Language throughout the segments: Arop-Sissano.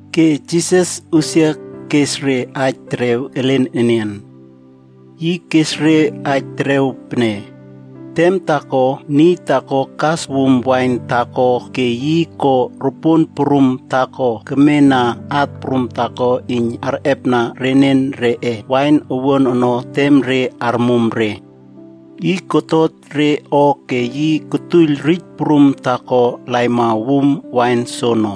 Ke Jisas usia kes re aij terew elen enian. Yi kes re aij terew pene, “Tem taako, niy taako kas wum wain taako ke yi ko ropuon prum taako kemena at prum taako iyn arꞌepna renen reꞌe wain owuan ono tem re armum re. Yi kotot re o ke yi kotuoiyl rij prum taako laima wum wain soono.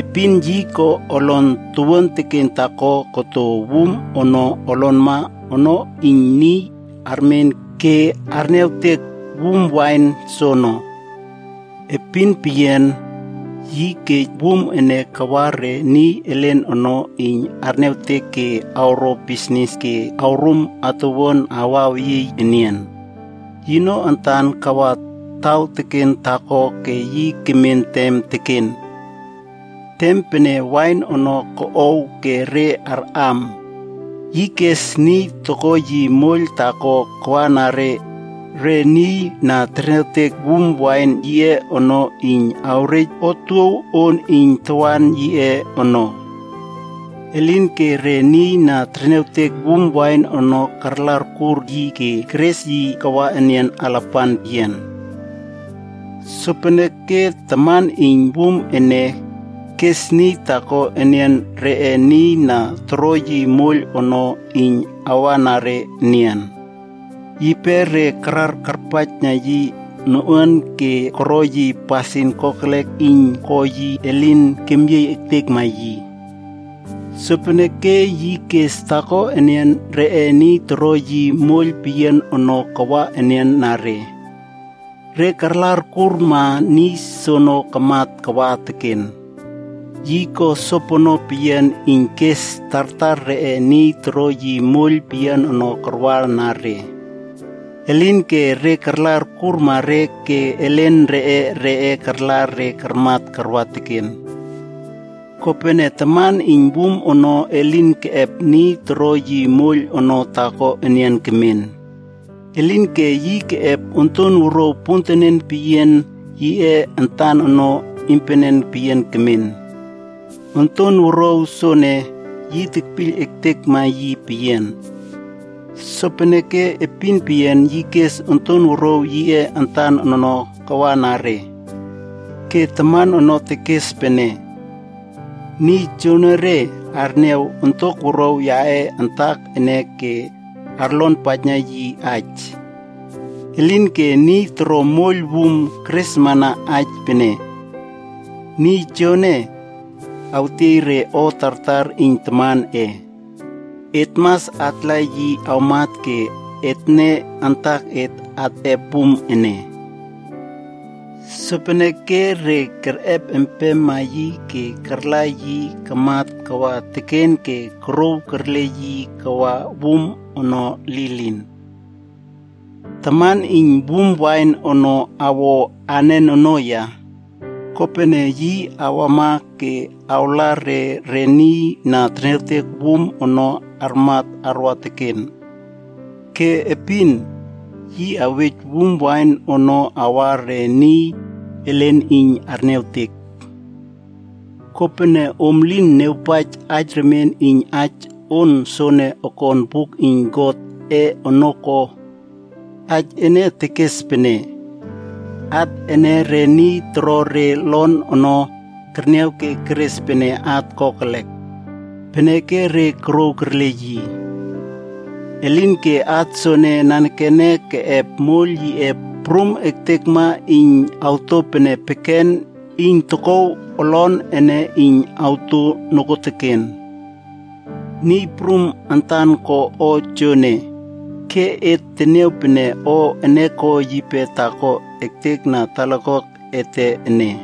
Epin yi ko olon towuan teken taako koto wum ono olonma ono iyn niy armen ke arniawtek wum wain soono. Epin peyian, yi kej wum ene kawa re niy elen ono iyn arniawtek ke awro bisnis ke awrum atuwuan awaweyie yi enian. Yino antan kawa taw teken taako ke yi kemen tem teken. Tem pene wain ono koꞌow ke re arꞌam, yi kes niy toko yi moiyl taako kawana re niy na terniawtek wum wain yiꞌe ono iyn awrej yi otuow on iyn tawan yiꞌe ono. Elinke re niy na terniawtek wum wain ono karla arkur yi ke keres yi kawa enian alapan peyian. Sopeneke taman iyn wum ene, kes niy taako enian reꞌe niy na toro yi moiyl ono iyn kawana re enian. Yipe re karar akpaijna yi noꞌuan ke koro yi pasin kokelek iyn ko yi elin kemyiey ektekma yi. Sopeneke yi kes taako enian reꞌe niy toro yi moiyl peyian ono kawa enian na re. Re karla orkurma niy soono kamat kawa teken. Yi ko sopono peyian iyn kes tartar reꞌe niy toro yi moiyl peyian ono karwana re. Elinke re karla orkurma re ke elen reꞌe re karla re karmat karwa teken. “Kopene taman iyn wum ono elin keꞌep niy toro yi moiyl ono taako enian kemen. Elinke yi keꞌep onton wuruaw pontenen peyian yiꞌe antan ono iynpenen peyian ekmen. Onton wuruaw soene, yi tekpiyl ektekma yi peyian. Sopeneke epin peyian yi kes onton wuruaw yiꞌe antan ono kawana re. Ke taman ono tekes pene, ‘Niy joonore arniaw ontok wuruaw yaꞌe antak ene ke arlonpaijna yi aij.’ “Elinke re niy toro moiyl wum keresmana aij pene, ‘Niy joene awtiey re o tartar iyn tamanꞌe. Et mas atla yi awmat ke etne antaket atꞌep wum ene.’ Sopeneke re kerꞌep empema yi ke karla yi kamat kawa teken ke korouw kerle yi kawa wum ono lilin. “Taman iyn wum wain ono awo anen ono ya? Kopene yi awama ke awla re re niy na terniawtek wum ono armat arwa teken. Ke epin, yi awej wum wain ono awa re niy elen iyn arniawtek. Kopene, om lin niawpaij aij remien iyn aij on soene okon buk iyn Godꞌe ono ko? Aij ene tekes pene, ‘At ene re niy toro re olon ono kerniaw ke keres pene at kokelek. Peneke re korouw kerle yi. Elinke, at soene nanekene keꞌep moiyl yiꞌe prum ektekma iyn awto pene peken iyn tokouw olon ene iyn awto nokuoteken. Niy Prum antan ko o joene, ke et teniaw pene o ene ko yipe taako ektek na talakuak ete ene.’”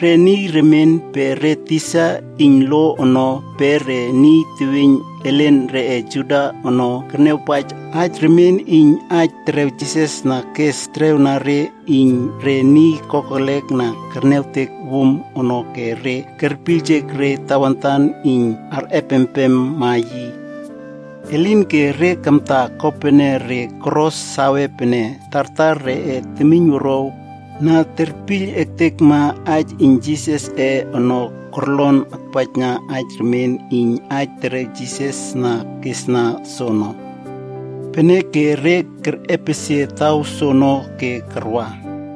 Re niy remien pe re tisa iyn lo ono pe re niy teweiyn elen reꞌe Juda ono kerniawpaij aij remien iyn aij terew Jisas na kes terewna re iyn re niy kokelek na kerniawtek wum ono ke re kerpiyljek re tawantan iyn arꞌepempema yi. Elinke re kamtaa kopene re koro save pene tartar reꞌe temiynwuruaw na terpiyl ektekma aij iyn Jisasꞌe ono korlon akpaijna aij remien iyn aij terew Jisas na kesna soono. Peneke re kerꞌepesie taw soono ke karwa.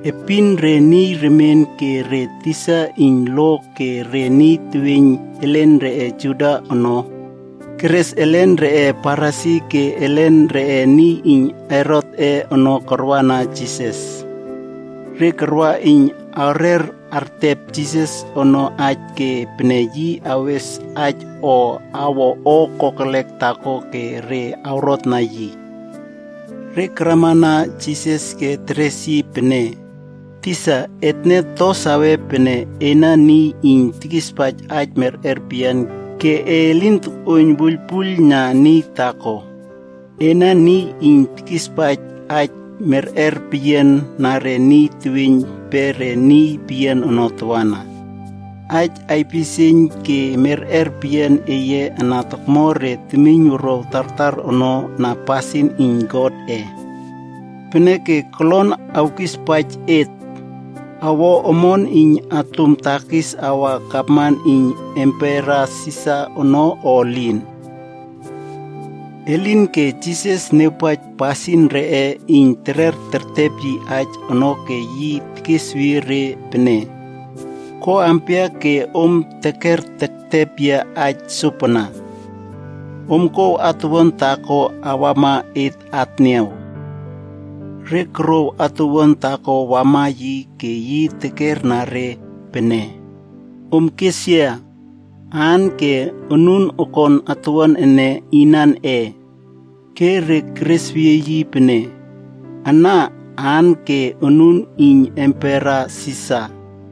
Epin re niy remien ke re tisa iyn lo ke re niy teweiyn elen reꞌe Juda ono, keres elen reꞌe Farisi ke elen reꞌe niy iyn Herotꞌe ono karwana Jisas. Re karwa iyn awrer ertep Jisas ono aij ke pene yi awes aij o awo o kokelek taako ke re awrotna yi. Re karamana Jisas ke teres yi pene, “Tisa, etne save pene ena niy iyn tekispaij aij merꞌer peyian ke e lin tokꞌuoiyn wuiylpuiyl na niy taako. Ena niy iyn tekispaij aij merꞌer peyian na re niy teweiyn pe re niy peyian ono tawana. Aij aipisieiyn ke merꞌer peyian eye ana tokmo re temiynwuruaw tartar ono na pasin iyn Godꞌe. Peneke kolon awkispaij et: Awo omon iyn atum takis awa gavman iyn Empera Sisar ono o elin?” Elinke Jisas niawpaij pasin reꞌe iyn terer tertep yi aij ono ke yi tekesweyie re pene, “Ko ampia ke om teker tektep yia aij sopana? Om kouw atuwuan taako awama et atniaw.” Re korouw atuwuan taako wama yi ke yi tekerna re pene, “Om kes yia, aan ke onun akon atuwuan ene inanꞌe?” Ke re keresweyie yi pene, “Ana aan ke onun iyn Empera Sisar.”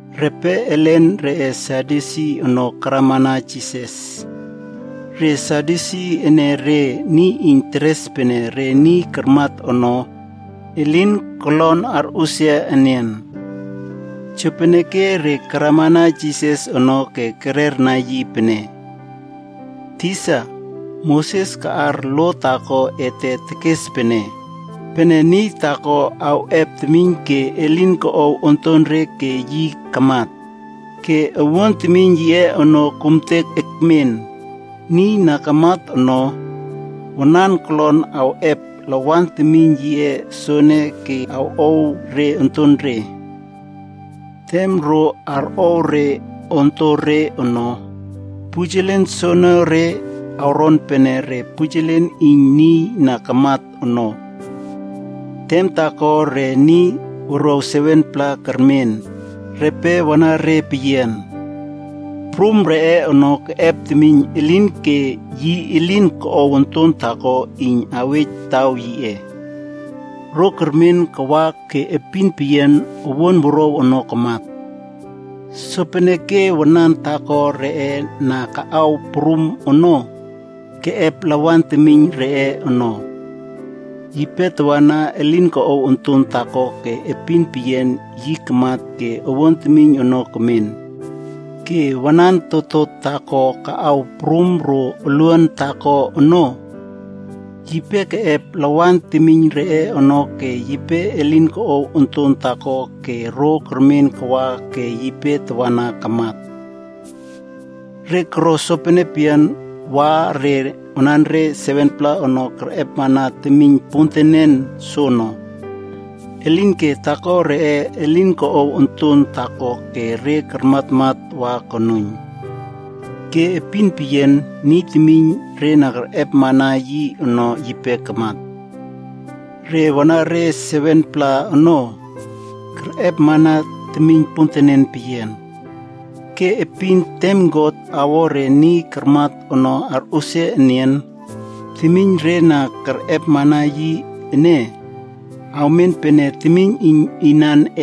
Repe elen reꞌe Sadyusi ono karamana Jisas. Re Sadyusi ene re niy iyn teres pene re niy karmat ono, elin kolon arꞌusia enian. Jopeneke re karamana Jisas ono ke kererna yi pene, “Tisa, Moses kaꞌar lo taako ete tekes pene, pene niy taako awꞌep temiyn ke elin koꞌow ontonre ke yi kamat, ke awuan temiyn yiꞌe ono kumtek ekmen, niy na kamat ono, wanan kolon awꞌep lawan temiyn yiꞌe soene ke awꞌow re ontonre. Tem ro arꞌow re ontore ono, pujelen soonore awron pene re pujelen iyn niy na kamat ono. Tem taako re niy wuruaw 7-pla kermen, repe wanare peyian. Prum reꞌe ono keꞌep temiyn elinke yi elin koꞌow onton taako iyn awej taw yiꞌe. Ro kermen kawa ke epin peyian owuan wuruaw ono kamat. Sopeneke wanan taako reꞌe na kaꞌaw prum ono, keꞌep lawan temiyn reꞌe ono. Yipe tawana elin koꞌow onton taako ke epin peyian yi kamat ke owuan temiyn ono kemen. Ke wanan totot taako kaꞌaw prum ro oluan taako ono, yipe keꞌep lawan temiyn reꞌe ono ke yipe elin koꞌow onton taako ke ro kermen kawa ke yipe tawana kamat. Re koro sopene peyian wa re wanare 7-pla ono kerꞌepmana temiyn pontenen soono. Elinke taako reꞌe elin koꞌow onton taako ke re karmatmat wa konuiyn. Ke epin peyian niy temiyn re na kerꞌepmana yi ono yipe kamat. Re wanare 7-pla ono, kerꞌepmana temiyn pontenen peyian. Ke epin tem God awo re niy karmat ono arꞌusia enian, temiyn re na kerꞌepmana yi ene, awmen pene temiyn iyn inanꞌe?” Ke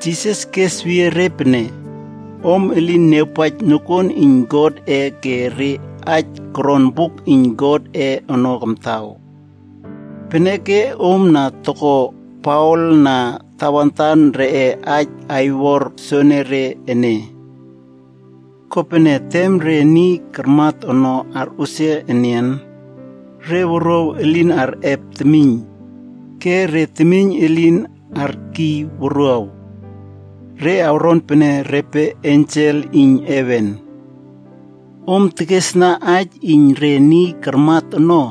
Jisas kesweyie re pene, “Om elin niawpaij nokuon iyn Godꞌe ke re aij koron buk iyn Godꞌe ono kamtaw. Peneke om na toko paol na tawantan reꞌe aij aiwor soenere ene. Kopene tem re niy karmat ono arꞌusia enian, re wuruaw elin arꞌep temiyn, ke re temiyn elin arkiy wuruaw. Re awron pene repe ensel iyn heven. “Om tekesna aij iyn re niy karmat ono,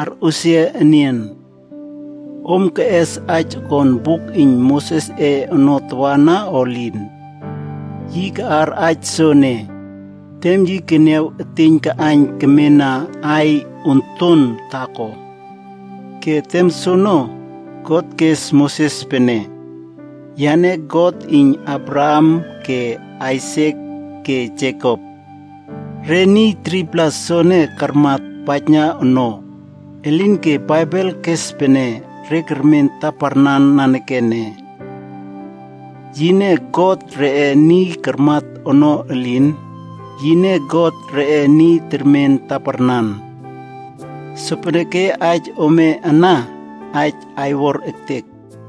arꞌusia enian. Om keꞌes aij okon buk iyn Mosesꞌe ono tawana o elin? Yi kaꞌar aij soene, tem yi keniaw eteiyn kaꞌaiyn kemena aiy onton taako. Ke tem soono, God kes Moses pene, ‘Yane God iyn Abraham ke Aisak ke Jekop.’ Re niy 3-pla soene karmat paijna ono, elinke Baibel kes pene re kermen taparnan nanekene. Yine God reꞌe niy karmat ono elin, yine God reꞌe niy termen taparnan. Sopeneke aij ome ana, aij aiwor ektek.”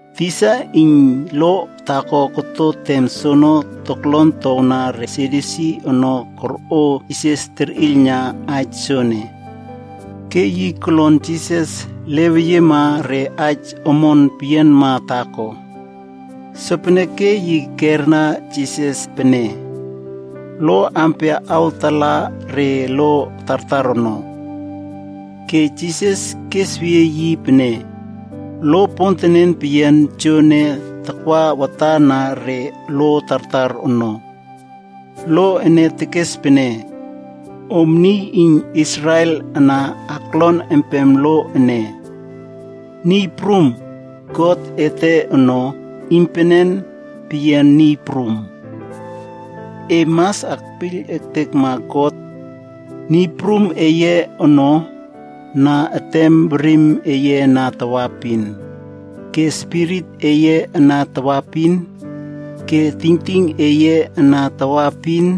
Tisa iyn lo taako koto tem soono toklon towna re Sadyusi ono korꞌo Jisas terꞌiylna aij soene. Ke yi kolon Jisas leweyiema re aij omon peyianma taako. Sopeneke yi kerna Jisas pene, “Lo ampia awtala re lo tartar ono?” Ke Jisas kesweyie yi pene, “Lo pontenen peyian joene takwa watan na re lo tartar ono. Lo ene tekes pene, ‘Om niy iyn Israel ana aklon empem lo ene. Niy Prum, God ete ono, iynpenen peyian Niy Prum. E mas akpiyl ektekma God, Niy Prum eye ono, na etem werim eye ana tawaepin, ke spirit eye ana tawaepin, ke tingting eye ana tawaepin,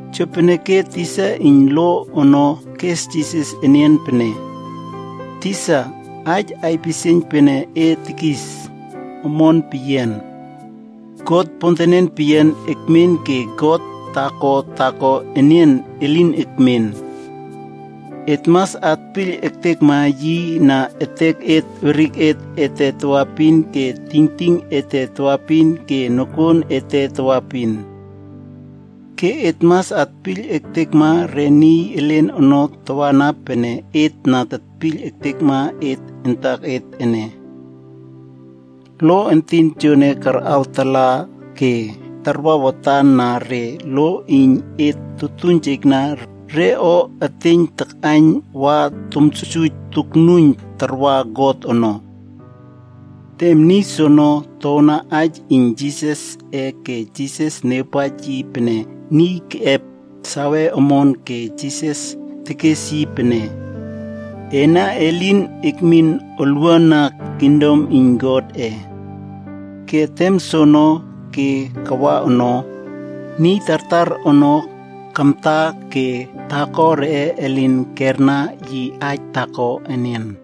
Jopeneke tisa iyn lo ono kes Jisas enian pene, “Tisa, aij aipisieiyn pene e tekis, omon peyian. God pontenen peyian ekmen ke God taako taako enian elin ekmen. Et mas atpiyl ektekma yi na etek weriket ete tawaepin ke tingting ete tawaepin ke nokuon ete tawaepin. Ke et mas atpiyl ektekma re niy elen ono tawana pene et na tetpiyl ektekma et antaket ene. Lo entin tojoene karꞌawtala ke tarwa watan na re lo iyn et totuiynjekna re o eteiyn takꞌaiyn wa tomsuijsuij toknuiyn tarwa God ono.” Tem niy soono towna aij iyn Jisasꞌe ke Jisas niawpaij yi pene niy keꞌep save omon ke Jisas tekes yi pene, “Ena elin ekmin olwuana kingdom iyn Godꞌe.” Ke tem soono ke kawa ono, niy tartar ono kamta ke taako reꞌe elin kerna yi aij taako enian.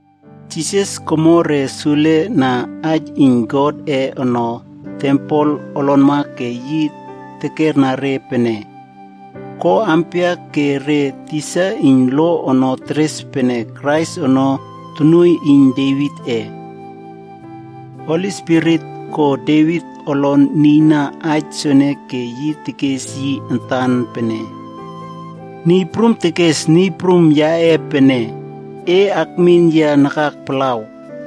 Jisas komo re sule na aij iyn Godꞌe ono tempel olonma ke yi tekerna re pene, “Ko ampia ke re tisa iyn lo ono teres pene Krais ono tonuoiy iyn Devitꞌe? Holi Spirit ko Devit olon nieiyna aij soene ke yi tekes yi antan pene, Niy Prum tekes Niy Prum yaꞌe pene, “E akmin yia nakak palaw,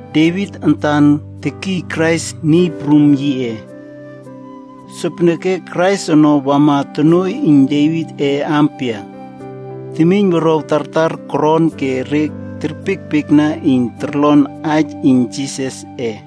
“Devit antan tekiy Krais Niy Prum yiꞌe. Sopeneke Krais ono wama tonuoiy iyn Devitꞌe ampia?” Temiyn wuruaw tartar koron ke re terpiekpiekna iyn torlon aij iyn Jisasꞌe.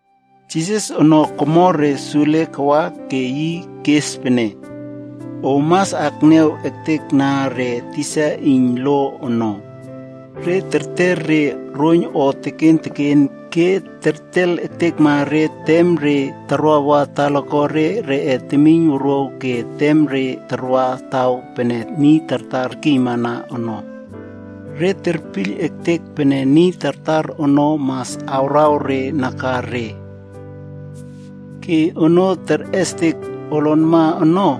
Jisas ono komo re sule kawa ke yi kes pene, “Om mas akniaw ektekna re tisa iyn lo ono. Re terter re roiyn o teken teken ke tertel ektekma re tem re tarwawa talakuare reꞌe temiynwuruaw ke tem re tarwa re taw pene niy tartar terkiymana ono. Re terpiyl ektek pene niy tartar ono mas awraw re nakare. Ke onoo terꞌestek olonma ono,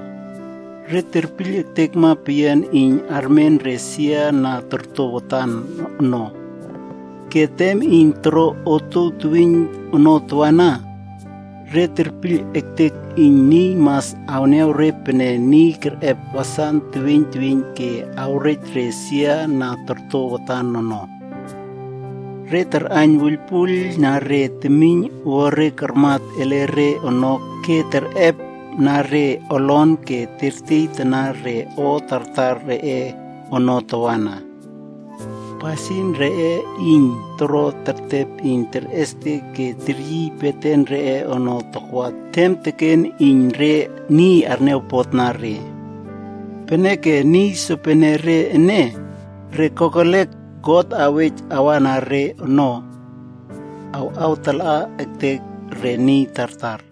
re terpiyl ektekma peyian iyn armen re sia na torto watand ono. Ke tem iyn toro otuow teweiyn ono tawana, re terpiyl ektek iyn niy mas arniaw re pene niy kerꞌep wasan teweiyn teweiyn ke awrej re sia na torto watan ono. Re tarꞌaiyn wuiylpuiylna re temiyn owuare karmat ele re ono ke terꞌepna re olon ke tertiey tana re o tartar reꞌe ono tawana. Pasin reꞌe iyn toro tertep iyn terꞌestek ke teryiy beten reꞌe ono takwa tem teken iyn re niy arniawpotna re. Peneke niy sopenere ene, re kokelek God awej awana re ono, awꞌawtala ektek re niy tartar.”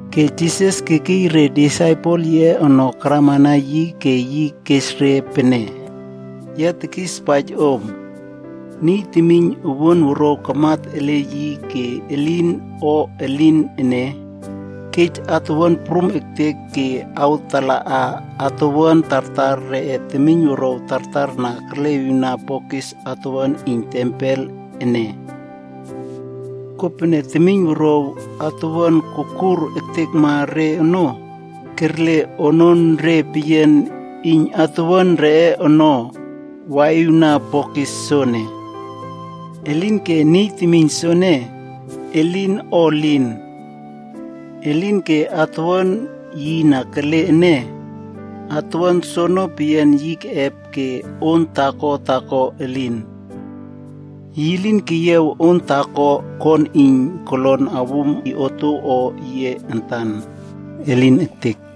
Ke Jisas kekiy re disaipel yiꞌe ono karamana yi ke yi kes re pene, “Ya tekispaij om. Niy temiyn owuan wuruaw kamat ele yi ke elin o elin ene, kej atuwuan prum ektek ke awtalaꞌa atuwuan tartar re temiyn wuruaw tartar na kerleꞌiwna bokis atuwuan iyn tempel ene. Kopene temiyn wuruaw atuwuan kokur ektekma re ono, kerle ononre peyian iyn atuwuan reꞌe ono waꞌiwna bokis soene. Elinke niy temiyn soene, elin o elin. Elinke atuwuan yi na kele ene, atuwuan soono peyian yi keꞌep ke on taako taako elin. Yi lin keyiaw on taako kon iyn yi kolon awum yi otuow o yiꞌe antan. Elin ektek!”